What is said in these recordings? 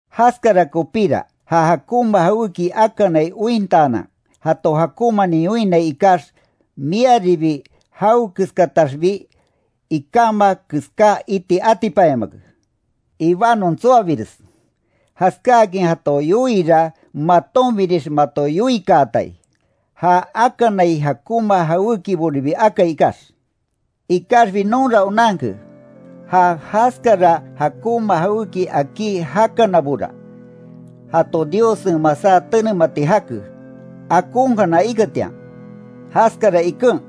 Jaskara kopíra, ja jakonma jawéki akanai ointaanan, jato jakonmanin yoinnai ikax, miaribi jawe keskataxbi ikama keská iti atipanyamake. Ibanon tsoabires, jaskáakin jato yoiira, matonbinix mato yoikaatai, ja akanai jakonma jawékiboribi akai ikax. Ikaxbi nonra onanke, ja jaskara jakonma jawéki akí jakanabora, jato Diossen masá tenemati jake, akonkana iketian. Jaskara iken,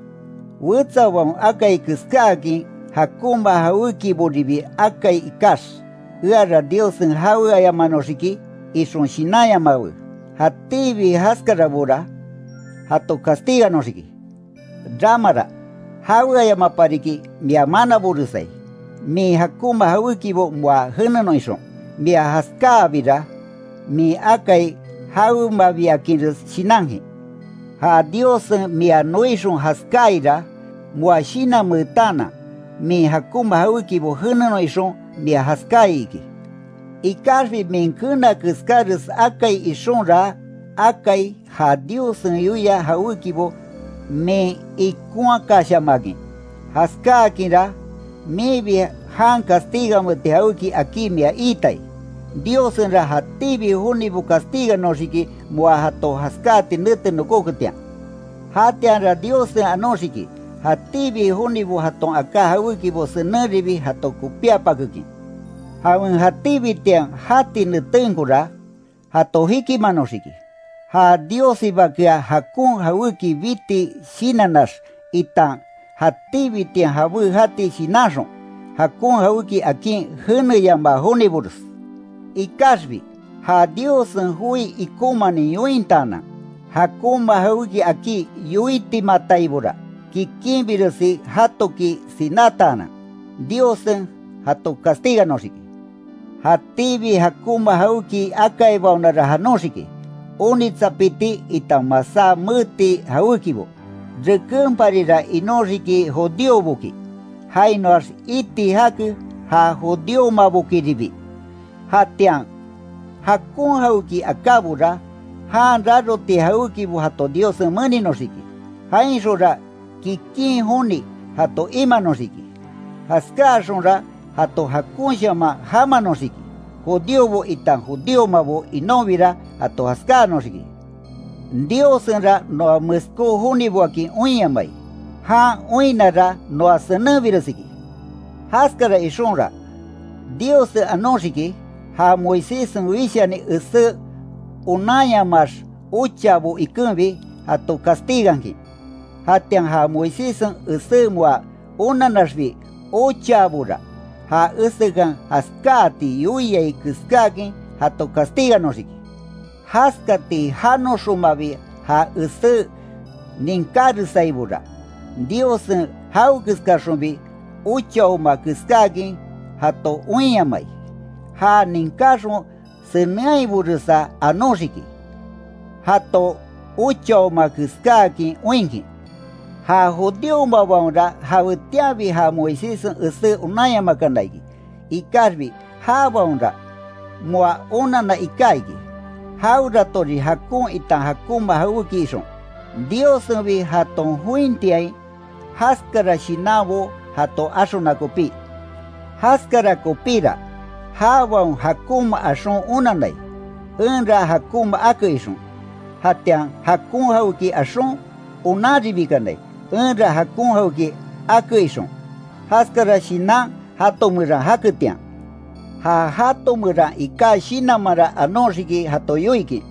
wetsabaon akai keskáakin jakonma jawékiboribi akai ikax, eara Diossen jaweayamanoxiki, ixon shinanyamawe. Jatíbi jaskarabora, jato castiganoxiki. Ramara, jaweayamaparikin mia manaboresai, min jakonma jawékibo moa jenenon ixon. Mia jaskáabira, min akai jawemabiakinres shinankin. Ja Diossen mia noixon jaskáaira, moa shinanmeetaanan, min jakonma jawékibo jenenon ixon, mia jaskai iki. Ikaxbi min keena keskáres akai ixonra akai ja Diossen yoia jawékibo min ikonhakashamakin. Jaskáakinra, minbi jan castigameti jawéki akí mia iitai. Diossenra jatíbi jonibo castiganoxiki moa jato jaskáati nete nokoketian. Jatianra Diossen anoxiki, jatíbi jonibo jaton aká jawékibo senenribi jato kopíapakekin, jawen jatíbitian jati netenkora, jato jikimanoxiki, ja Diossibakea jakon jawéki biti shinannax itan jatíbitian jabé jati shinanxon, jakon jawéki akin jeneyamaa jonibores. Ikaxbi, ja Diossen joi ikonmanin yointaanan, jakonma jawéki akí yoitimataibora, kikinbiresi jatoki sinátaanan, Diossen jato castiganoxiki. Jatíbi jakonma jawéki akaibaonara janoxiki, onitsapiti itan masá meeti jawékibo. Rekenparira inóxiki judíoboki, jainoax iti jake ja judíomabokiribi. Jatian, jakon jawéki akábora, jan raroti jawékibo jato Diossen meninoxiki, jainxonra kikin joni jato imanoxiki, jaskáaxonra jato jakonshaman jamanoxiki. Judíobo itan judíomabo inonbira jato jaskáanoxiki. Diossenra noa meskó joniboakin oinyamai. Jan oinnara, noa senenbires iki. Jaskara ixonra, Diossen anoxiki, ja Moiséssen wishani esé onanyamaax ochaabo ikenbi, jato castigankin. Jatian ja Moiséssen esé moa onannaxbi ochaabora, ja esekan jaskáati yoiai keskáakin jato castiganoxiki. Jaskati janoxonmabi ja esé ninkáresaibora, Diossen jawekeskaxonbi ochaoma keskáakin jato oinyamai, ja ninkaxon senenhaiboresa anoxiki, jato ochaoma keskáakin oinkin. Ja judíomabaonra, jawetianbi ja Moiséssen esé onanyamakana iki, ikaxbi jabaonra, moa onanna iká iki, jaweratorin jakon itan jakonma jawéki ixon, Diossenbi jaton jointiain, jaskara shinanbo jato axona kopí. Jaskara kopíra, jabaon jakonma axon onannai, enra jakonma ake ixon, jatian jakon jawéki axon, onanribikanai, enra jakon jawéki ake ixon, jaskara shinan jato meran jaketian. Ja jato meran iká shinanmanra anoxiki jato yoikin,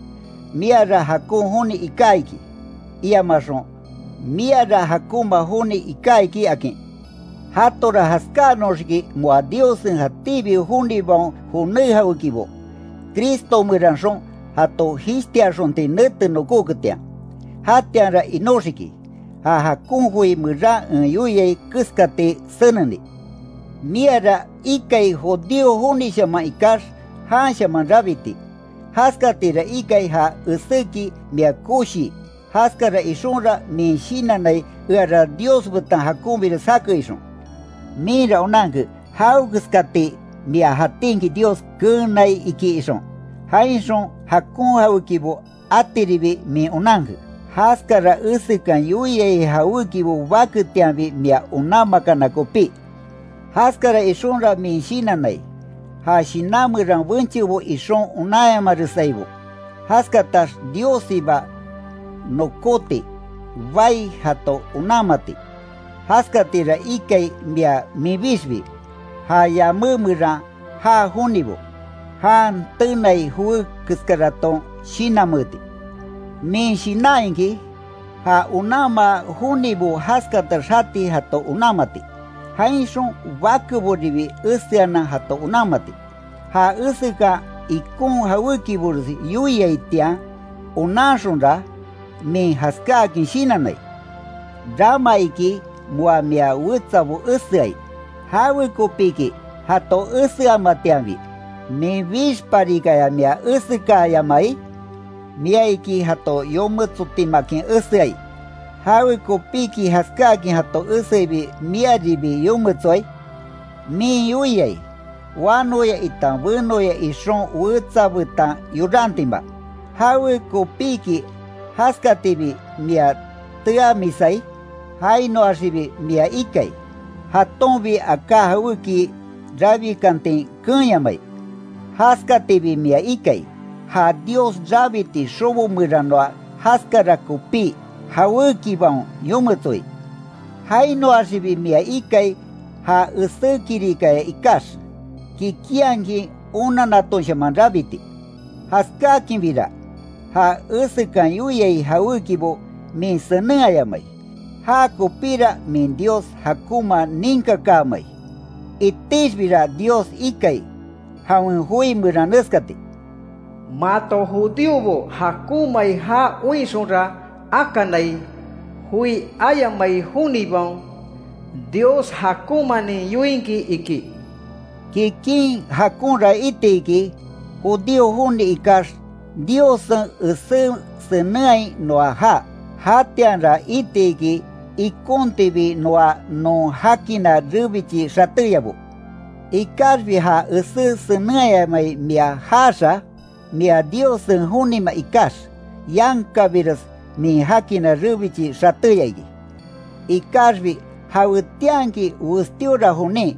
miara jakon joni iká iki, iamaxon, miara jakonma joni iká iki, akin. Jatora jaskáanoxiki moa Diossen jatíbi jonibaon joné jawékibo, Cristo meranxon jato jishtiaxonti nete nokóketian, jatianra inóxiki, ja jakon joi meran en yoiai keskati seneni. Miara ikai judío jonishaman ikax, janshaman rabiti, jaskatira ikai ja eséki mia koshii, jaskara ixonra min shinannai eara Dios betan jakonbires jake ixon. Minra onanke, jawekeskati mia jatinki Dios keenai iki ixon, jainxon jakon jawékibo atiribi min onanke, jaskara esekan yoiai jawékibo baketianbi mia onanmakana kopí. Jaskara ixonra min shinannai, ja shinan meran benchebo ixon onanyamaresaibo, jaskatax Diossiba nokóti bai jato onanmati. Jaskatira ikai mia minbixbi, ja yamé meran já jonibo, jan tenai joé keskaraton shinanmeeti. Min shinan iki, ja onanma jonibo jaskatax jati jato onanmati, jainxon bakeboribi eseanan jato onanmati. Ja esekan ikon jawékibores yoiaitian onanxonra, min jaskáakin shinannai. Rama iki moa mia wetsabo eseai ¿Jawekopíki jato eseamatianbi, minbixparikaya mia esekaayamai? Mia iki jato yometsotimaakin eseai ¿Jawekopíki jaskáakin jato eseibi miaribi yometsoai? Min yoiai, wanoya itan benoya ixon wetsa betan yorantima. ¿Jawekopíki jaskatibi mia teamisai? Jainoaxibi mia ikai, jatonbi aká jawéki rabikantin keenyamai. Jaskatibi mia ikai, ja Dios rabiti xobo meranoa jaskara kopí, jawékibaon yometsoi. Jainoaxibi mia ikai, ja esé kirikaya ikax, kikinhakin onannatonshaman rabiti, jaskákinbira, ja esekan yoiai jawékibo min senenhayamai, jakopira min Dios jakonma ninkakamai. Itixbira Dios ikai, jawen joi meran neskati: Mato judíobo jakonmai jaa oinxonra akanai, joi ayamai jonibaon, Dios jakonmanin yoinkin iki. Kikin jakonra iti iki, judío joni ikax Diossen esé senenhai noa jaa, jatianra iti iki ikontibi noa non jakina rebichi xatéyabo. Ikaxbi ja esé senenhayamai mia jaaxa, mia Diossen jonima ikax, yankabires min jakina rebichi xatéya iki. Ikaxbi jawetianki westíora jonin,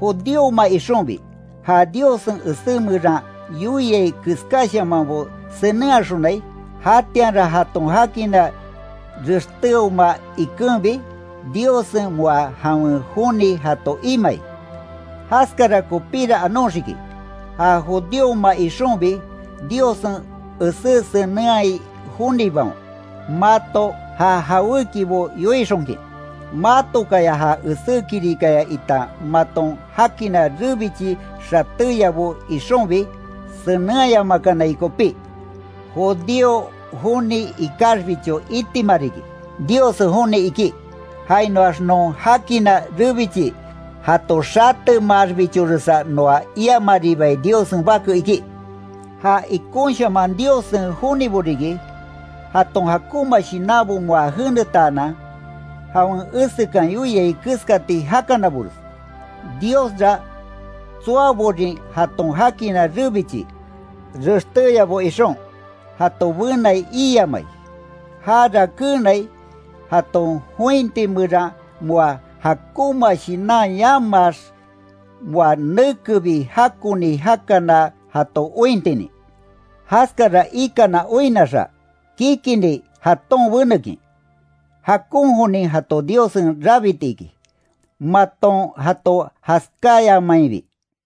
judíoma ixonbi, ja Diossen esé meran yoiai keskáshamanbo senenhaxonai, jatianra jaton jakina rextéoma ikenbi, Diossen moa jawen joni jato imai. Jaskara kopíra anoxiki, ja judíoma ixonbi, Diossen esé senenhai jonibaon, mato ja jawékibo yoixonkin, matokaya ja esé kirikaya itan maton jakina rebichi xatéyabo ixonbi, senenhayamakanai kopí. Judío joni ikaxbicho itima riki, Diossen joni iki, jainoax non jakina rebichi jato xatemaaxbichoresa noa iamaribai Diossen bake iki. Ja ikonshaman Diossen jonibo riki, jaton jakonma shinanbo moa jenetaanan, jawen esekan yoiai keskati jakanabores. Diosra tsoaborin jaton jakina rebichi rextéyabo ixon, jato benai iiamai, jara keenai, jaton jointi meran moa jakonma shinan yamaax, moa nekebi jakoni jakana jato ointinin. Jaskara ikana oinnaxa, kikinni jaton benekin, jakon jonin jato Diossen rabiti iki, maton jato jaskayamainbi.